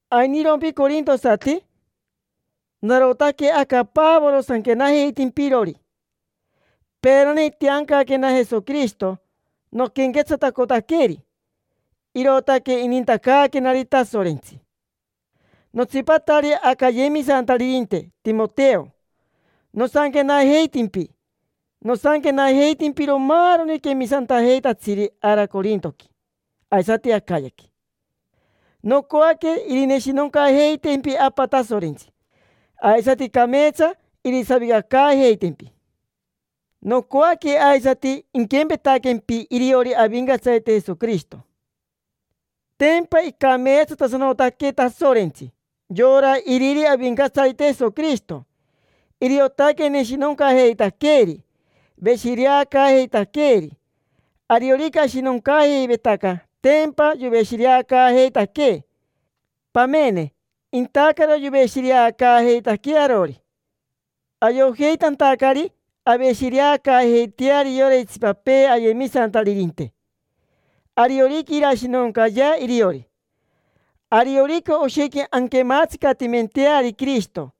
¿Ainirompi corintosati? Narotaque aca Pavoro sanquenajeitimpirori. Peerani itiancaquena Jesoquirishito noquenquetsatacotaqueri, irootaque inintacaaquenari Tasorentsi. Notsipatari aca ayemisantaririnte Timoteo nosanquenajeitimpi. Nosanquenajeitimpiro maaroni quemisantajeitatsiri ara corintoqui aisati Acayaqui. Nocoaque irineshinoncajeitempi Apa Tasorentsi, aisati cameetsa irisavicacaajeitempi. Nocoaque aisati inquempetaquempi iriori Avincatsarite Jesoquirishito. Tempa icameetsatasanotaque Tasorentsi, yora iriri Avincatsarite Jesoquirishito. Iriotaque neshinoncajeitaqueeri, veshireacaajeitaqueeri. Ariorica ashinoncaajeivetaca tempa yoveshireacaajeitaquee. Pamene, intacaro yoveshireacaajeitaquee arori, ayojeitantacari aveshireacaajeiteari yora itsipapee ayemisantaririnte, ariorica irashinoncayea iriori. Ariorica oshequi anquematsicatimenteari Quirishito,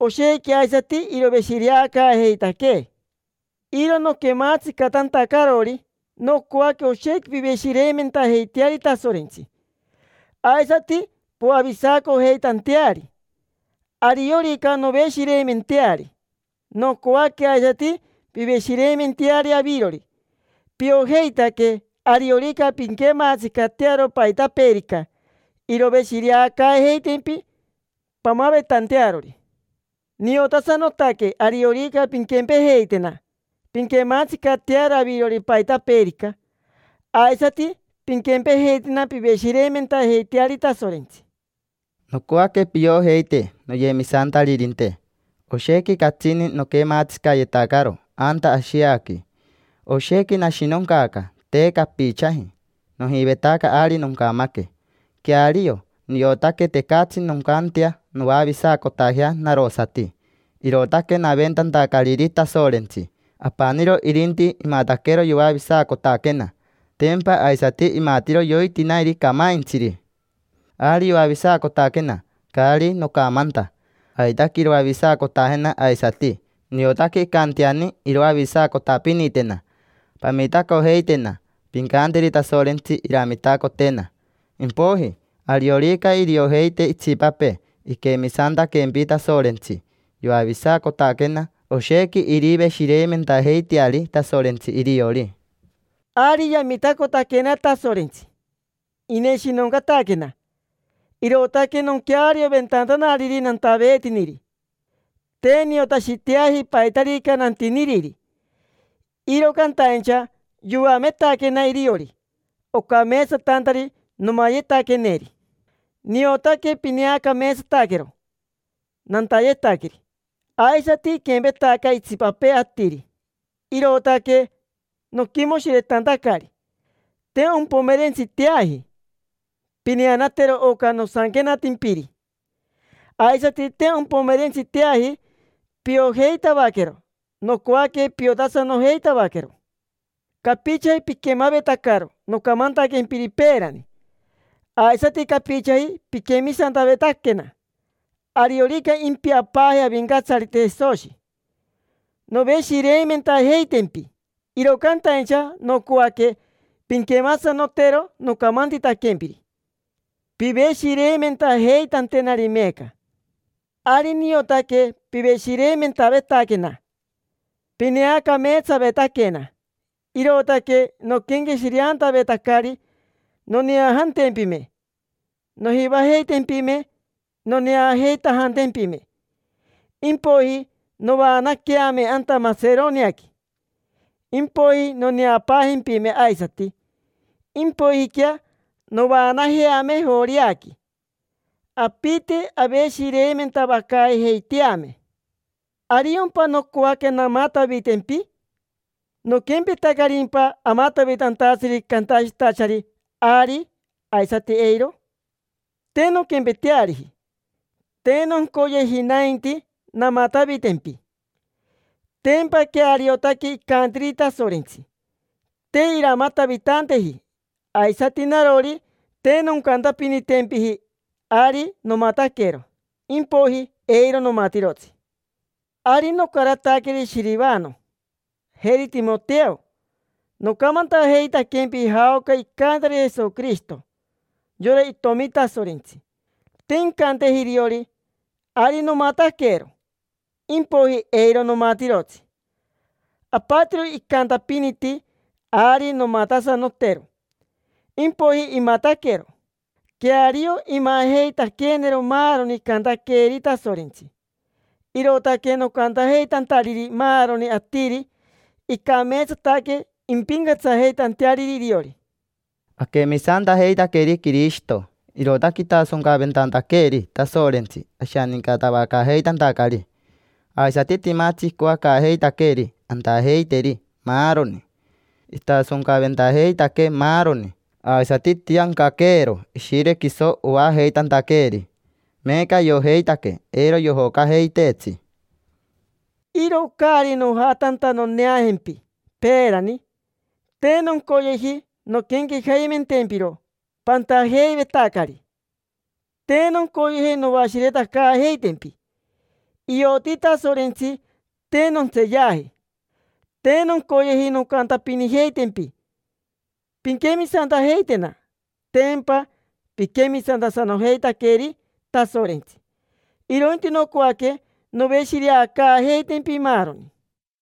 oshequi aisati iroveshireacaajeitaquee. Iro noquemaatsicatantacarori nocoaque oshequi piveshireimentajeiteari Tasorentsi, aisati poavisacojeitanteari. Ariorica noveshireimenteari, nocoaque aisati piveshireimenteari avirori: piojeitaque ariorica pinquematsicatearo paitapeerica, iroveshireacaajeitempi pamavetantearori. Niotasanotaque ariorica pinquempejeitena pinquematsicatearo avirori paitapeerica, aisati pinquempejeitena piveshireimentajeiteari Tasorentsi. Nocoaque piojeite, noyemisantaririnte, oshequi catsini noquematsicayetacaro anta Ashiaqui. Oshequi nashinoncaaca, te capichaji. Nojivetaca ari noncamaque. Queario, niotaque tecatsi noncantea noavisacotajea narosati, irootaque naventantacariri Tasorentsi. Apaniro irinti imataquero yoavisacotaquena: tempa aisati imatiro yoitinairi camaintsiri. Ari yoavisacotaquena, caari nocamanta; aitaque iroavisacotajena aisati, niotaque incanteani iroavisacotapinitena. Pamitacojeitena, pincanteri Tasorentsi iramitacotena. Impoiji, ariorica iriojeite itsipapee iquemisantaquempi Tasorentsi, yoavisacotaquena, oshequi iriveshireimentajeiteari Tasorentsi iriori. Ari yamitacotaquena Tasorentsi, ineshinoncataquena, irootaque noquearioventantanariri nantaveetiniri. Te niotashiteaji paitarica nantiniriri, iro cantaincha yoametaquena iriori ocameetsatantari nomayetaqueneri. Niotaque pineacameetsataquero nantayetaqueri, aisati iquempetaca itsipapee atiri, irootaque noquimoshiretantacari. Te ompomerentsiteaji pineanatero oca nosanquenatimpiri, aisati te ompomerentsiteaji piojeitavaquero. Nocoaque piotasanojeitavaquero. Capichaji piquemavetacaro nocamantaquempiri peerani, aisati capichaji piquemisantavetaquena. Ariorica impiapaaje Avincatsarite Jesoshi, noveshireimentajeitempi, iro cantaincha nocoaque pinquemasanotero nocamantitaquempiri piveshireimentajeitantenari meeca. Ari niotaque piveshireimentavetaquena, pineacameetsavetaquena, irootaque noquenqueshireantavetacari noneajantempime. Nojivajeitempime noneajeitanajempime, impoiji novaanaqueame anta Maseroniaqui. Impoiji noneapaajempime aisati, impoijiquea novaanajeame Joreaqui. Apite aveshireimentavacaajeiteame. ¿Ariompa nocoaque namatavitempi? ¿Noquempetacarimpa amatavitantatsiri cantashitachari: “Ari”, aisati: “Eiro”? Te nonquempeteariji. Te noncoyeji nainti namatavitempi. Tempa queariotaque icantiri Tasorentsi, te iramatavitanteji. Aisati narori, te noncantapinitempiji: “Ari nomataquero”, impoiji: “Eiro nomatirotsi”. Ari nocarataqueri Shirivano, jeri Timoteo nocamantajeitaquempi jaoca icantari Jesoquirishito, yora Itomi Tasorentsi. Te incanteji iriori: “Ari nomataquero”, impoiji: “Eiro nomatirotsi”. Apatiro icantapiniti: “Ari nomatasanotero”, impoiji imataquero. Queario imajeitaqueenero maaroni icantaqueeri Tasorentsi. Irootaque nocantajeitantariri maaroni atiri icameetsataque, impincatsajeitanteariri iriori. Aquemisantajeitaqueri Quirishito, irootaque itasoncaventantaqueeri Tasorentsi ashanincatavacaajeitantacari. Aisati timatsi icoacaajeitaqueeri antajeiteri, maaroni. Itasoncaventajeitaquee maaroni, aisati itiancaqueero Ishire quiso oajeitantaqueeri. Meeca ayojeitaque eiro yojocajeiteetsi. Iro caari nojatanta noneajempi peerani, te noncoyeji nonquenquejaimentempiro pantajeivetacari, te noncoyeji noashiretacaajeitempi. Ioti Tasorentsi te nontseeyaji. Te noncoyeji noncantapinijeitempi pinquemisantajeitena, tempa piquemisantasanojeitaqueri Tasorentsi. Irointi nocoaque noveshireacaajeitempi, maaroni.